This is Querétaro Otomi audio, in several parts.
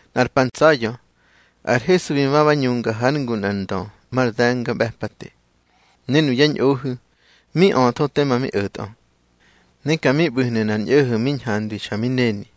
Nꞌar pa ntsa̱ya̱ ar Hesu bi ma ba ñunga hár ngu nꞌar ndö mar de̱ngaꞌbe̱pate, ne nuyá ñꞌohu̱ mi öthó tema mi o̱tꞌö. Ne ka mi ꞌbu̱hnu̱ nꞌar ñꞌo̱ho̱ mi ñhandwi xa mi neni.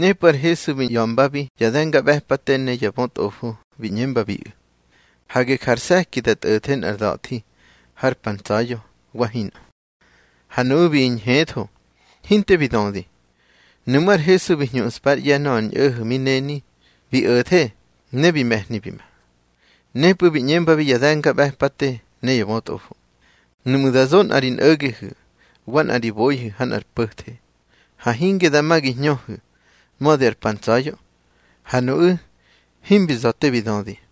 Nepꞌu̱ ar Hesu bi ꞌya̱mbabi ya de̱ngaꞌbe̱pate ne ya bötꞌofo, bi ꞌñembabiꞌu̱: —Hage ja ar se̱ki da tꞌo̱the nꞌar da̱thi har pa ntsa̱ya̱, wa hinꞌö. Ha nuꞌu̱ bi ñhetho, hinte bi dödi. Nuꞌmú̱ ar Hesu bi hñuꞌspa ár ꞌye̱ nöꞌö ar ñꞌo̱ho̱ mi neni, bi o̱the ne bi me̱hni bi ma. Nepꞌu̱ bi ꞌñembabi ya de̱ngaꞌbe̱pate ne ya bötꞌofo: —Nuꞌmu̱ da zo nꞌa ri nꞌo̱gehu̱ wa nꞌa ri boihu̱ ha nꞌar po̱the, ha hinge dama gi hñöhu̱ mödi ar pa ntsa̱ya̱. Ha nuꞌu̱ himbi za̱ te bi dödi.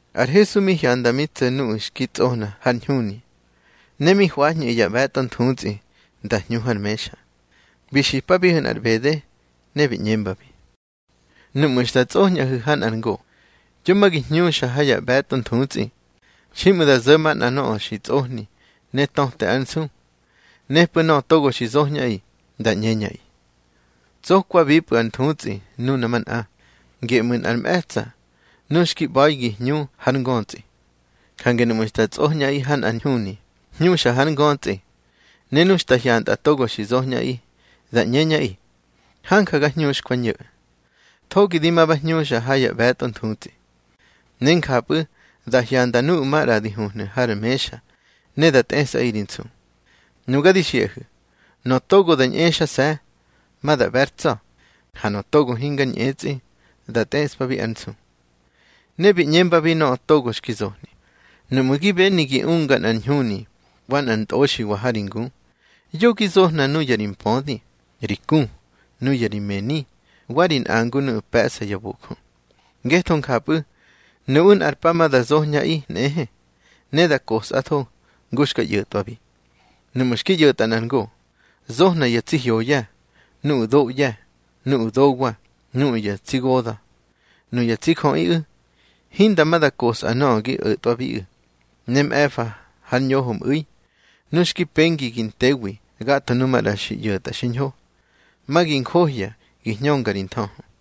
Ar Hesu mi hyanda mi tso̱ nuꞌu̱ xki tsꞌohna har ñhuni, ne mi hwañꞌu̱ ya ꞌbe̱tꞌo nthutsꞌi nda hñu har mexa. Bi xipabiꞌu̱ nꞌar ꞌbede, ne bi ꞌñembabi: —Núꞌmu̱ xta tsꞌoñꞌaꞌi ha nꞌar ngo, yo ma gi hñuxa ha ya ꞌbe̱tꞌo nthutsꞌi. Xiꞌmu̱ da zo̱ manꞌa nöꞌö xi tsꞌohni ne töte ár nsu. Nepꞌu̱ nöꞌö togo xi zoñꞌaꞌi, da ꞌñeñꞌaꞌi: Tsokwapꞌu̱ ar nthutsꞌi nuna manꞌa. Geꞌmu̱ nꞌar mꞌe̱tsa̱ nu xki ꞌba̱i gi hñu har ngötsꞌi. Jange núꞌmu̱ xta tsꞌoñꞌaꞌi ha nꞌar ñhuni, hñuxa har ngötsꞌi. Ne nu xta hyantꞌa togo xi zoñꞌaꞌi, da ꞌñeñꞌaꞌi: Hanja ga hñuxkwa, ño̱. Thogi di ma ba hñuxa ha ya ꞌbe̱tꞌo nthutsꞌi. Ne njapꞌu̱ da hyanda nuꞌu̱ maꞌra di huhnu̱ har mexa, ne da tꞌesꞌaꞌi ri nsu. Nuga di xiꞌahu̱, nöꞌö togo da ñꞌexase̱, ma da ꞌbe̱ ár tsa̱. Ha nöꞌö togo hingar ñꞌetsꞌi, da tꞌeꞌspabi ár nsu. Ne bi ꞌñembabi nöꞌö togo xki zohni: —Nuꞌmu̱ gi beni gi unga nꞌar ñhuni wa nꞌar ntꞌoxiwa ha ri ngu, yo gi zohna nuya ri mpödi, ri ku, nuya ri mëni, wa ri nꞌangu nuꞌu̱ pe̱ꞌsa ya bojö. Ngetho njapꞌu̱, nuꞌu̱ nꞌar pa ma da zoñꞌaꞌi nꞌehe, ne da kosꞌatho ngu xka ꞌyo̱tꞌwabi. Núꞌmu̱ xki ꞌyo̱tꞌa nꞌar ngo, zohna ya tsi hyoya, nuꞌu̱ doꞌye̱, nuꞌu̱ dowa, nuꞌu̱ ya tsi goda̱. Nuya tsi jöꞌiꞌu̱, hinda ma da kosꞌa nöꞌö gi o̱twabiꞌu̱. Ne mꞌe̱fa har ñoho mꞌu̱i, nu xki pengi gi ntewi gatho nu maꞌra xi ꞌyo̱tꞌa xiñho, ma gi njohya gi hñönga ri nthöhö.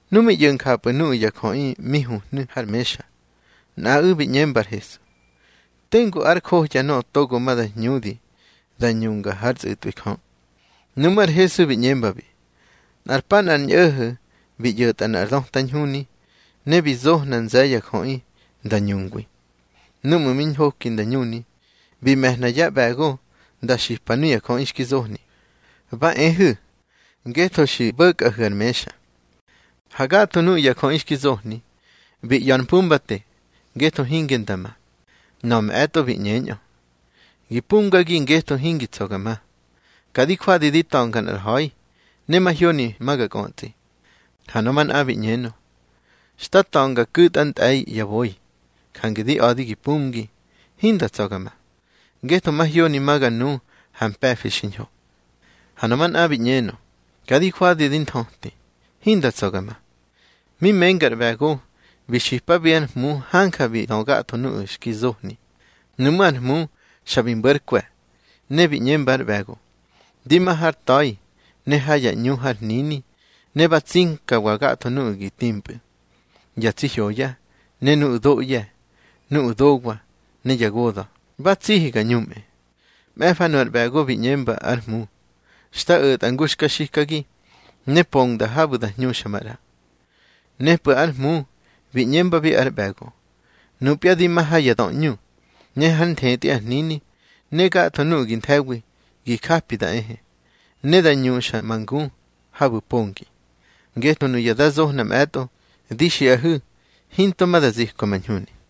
Nu mi ꞌyo̱ njapꞌu̱ nuꞌu̱ ya jöꞌi mi huhnu̱ har mexa, nꞌaꞌu̱ bi ꞌñemba ar Hesu: —Tengu ár johya nöꞌö togo ma da hñudi da ñunga hár tsꞌu̱tꞌwi Jö. Nuꞌmú̱ ar Hesu bi ꞌñembabi: —Nꞌar pa nꞌar ñꞌo̱ho̱ bi ꞌyo̱tꞌa nꞌar döta ñhuni, ne bi zohna nze̱ ya jöꞌi nda ñungwi. Núꞌmu̱ mi ñhoki nda ñuni, bi me̱hna yá ꞌbe̱go nda xipa nuya jöꞌi xki zohni: Ba ehu̱, ngetho xi ꞌbo̱kꞌahu̱ ar mexa. Ha gatho nuꞌu̱ ya jöꞌi xki zohni, bi ꞌya̱ ar mpumbate, ngetho hinge nda ma. Nöꞌö mꞌe̱tꞌo bi ꞌñenö: Gi pumgagi ngetho hingi tsa̱ ga ma. Ka di jwadi di ta̱nga nꞌar ha̱i, ne mahyoni ma ga kꞌötsꞌi. Ha nöꞌö manꞌa bi ꞌñenö: Xta ta̱nga ku̱tꞌa ntꞌe̱i ya boi. Jange di a̱di gi pumgi, hinda tsa̱ ga ma, ngetho mahyoni ma ga nu ha mpe̱fi xiñho. Ha nöꞌö manꞌa bi ꞌñenö: Ka di jwadi di nthöti, hinda tsa̱ ga ma. Mi menga ar ꞌbe̱go, bi xipabi ár hmu hanja bi dö gatho nuꞌu̱ xki zohni. Nuꞌmú̱ ar hmu xa bi mbo̱ ár kwe̱, ne bi ꞌñemba ár ꞌbe̱go: Di ma har ta̱i ne ha ya ꞌñu har hnini, ne ba tsinkawa gatho nuꞌu̱ gi timpꞌu̱, ya tsi hyoya, ne nuꞌu̱ doꞌye̱, nuꞌu̱ dowa, ne ya goda̱, ba tsihi ga ñumꞌe. Mꞌe̱fa nu ar ꞌbe̱go bi ꞌñemba ár hmu: Xta o̱tꞌa ngu xka xikagi, ne pongda habu̱ da hñuxa maꞌra. Nepꞌu̱ ar hmu bi ꞌñembabi ár ꞌbe̱go: Nupya di ma ha ya döꞌñu, ne hár nthetꞌi ar hnini. Ne gatho nuꞌu̱ gi nthe̱wi gi japi da ehe, ne da ñuxa ma ngu habu̱ pongi. Ngetho nuya da zohna mꞌe̱tꞌo, di xiꞌahu̱ hinto ma da zipka ma ñhuni.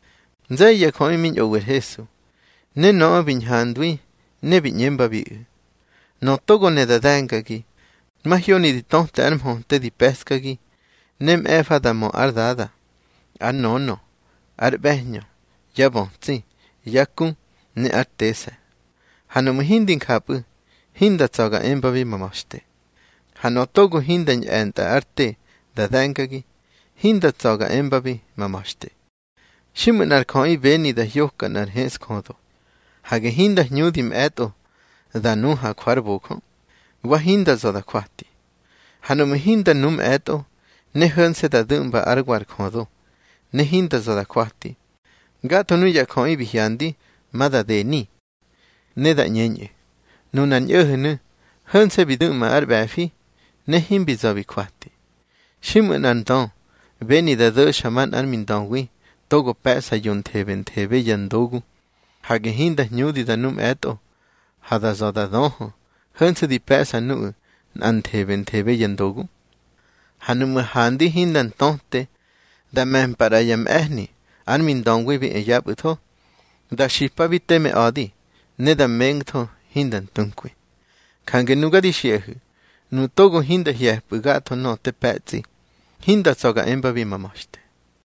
Nze̱ye̱ ya jöꞌi mi ñꞌowi ar Hesu, ne nöꞌö bi ñhandwi ne bi ꞌñembabiꞌu̱: —Nöꞌö togo ne da de̱ngagi, mahyoni di töte ar mhöte di pe̱ꞌskagi, ne mꞌe̱fa da mö ár dada, ár nönö, ár ꞌbe̱hñö, yá bötsi, yá ku, ne ár tese̱. Ha nuꞌmu̱ hindi njapꞌu̱, hinda tsa̱ ga embabi ma ma̱xte. Ha nöꞌö togo hinda ñꞌe̱ntꞌa ár te da de̱ngagi, hinda tsa̱ ga embabi ma ma̱xte. Xiꞌmu̱ nꞌar jöꞌi beni da hyoka nꞌar heꞌsjödo, hage hinda hñudi mꞌe̱tꞌo da nu ha jwa ar bojö, wa hinda za̱ da jwati. Ha nuꞌmu̱ hinda nu mꞌe̱tꞌo, ne ho̱nse̱ da du̱ꞌmba ár wa ar jödo, ne hinda za̱ da jwati, gatho nuꞌu̱ ya jöꞌi bi hyandi, ma da deni. Ne da ꞌñeñꞌu̱: Nunar ñꞌo̱ho̱nu̱, ho̱nse̱ bi du̱ꞌma ar ꞌbe̱fi, ne himbi za̱ bi jwati. Xiꞌmu̱ nꞌar ndö beni da do̱xa manꞌár mindöwi togo pe̱ꞌsa yonthebenthebe ya ndogu, hage hinda hñudi da nu mꞌe̱tꞌo, ha da za̱ da döhö hönse̱ di pe̱ꞌsa nuꞌu̱ nꞌanthebenthebe ya ndogu. Ha nuꞌmu̱ handi hinda ntöte, da me̱mpa ꞌra yá mꞌe̱hni ár mindöwi bi e yapꞌu̱tho, da xipabi teme a̱di, ne da mengtho hinda ntunkwi. Jange nuga di xiꞌahu̱, nuꞌu̱ togo hinda hye̱pꞌu̱ gatho nöꞌö te pe̱tsꞌi, hinda tsa̱ ga embabi ma ma̱xte.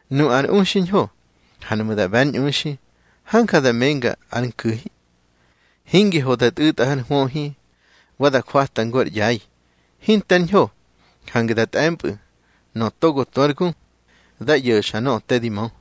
Nu ar u xiñho, ha nuꞌmu̱ da ꞌbe̱ ár ñꞌuxi, hanja da menga ár nku̱hi. Hingi ho da tꞌu̱tꞌa har hwöhi, wa da jwata ngu ar ꞌyai. Hinte ár ñho, jange da tꞌe̱mpꞌu̱. Nöꞌö togo tu ár gu, dá ꞌyo̱xa nöꞌö te di mö.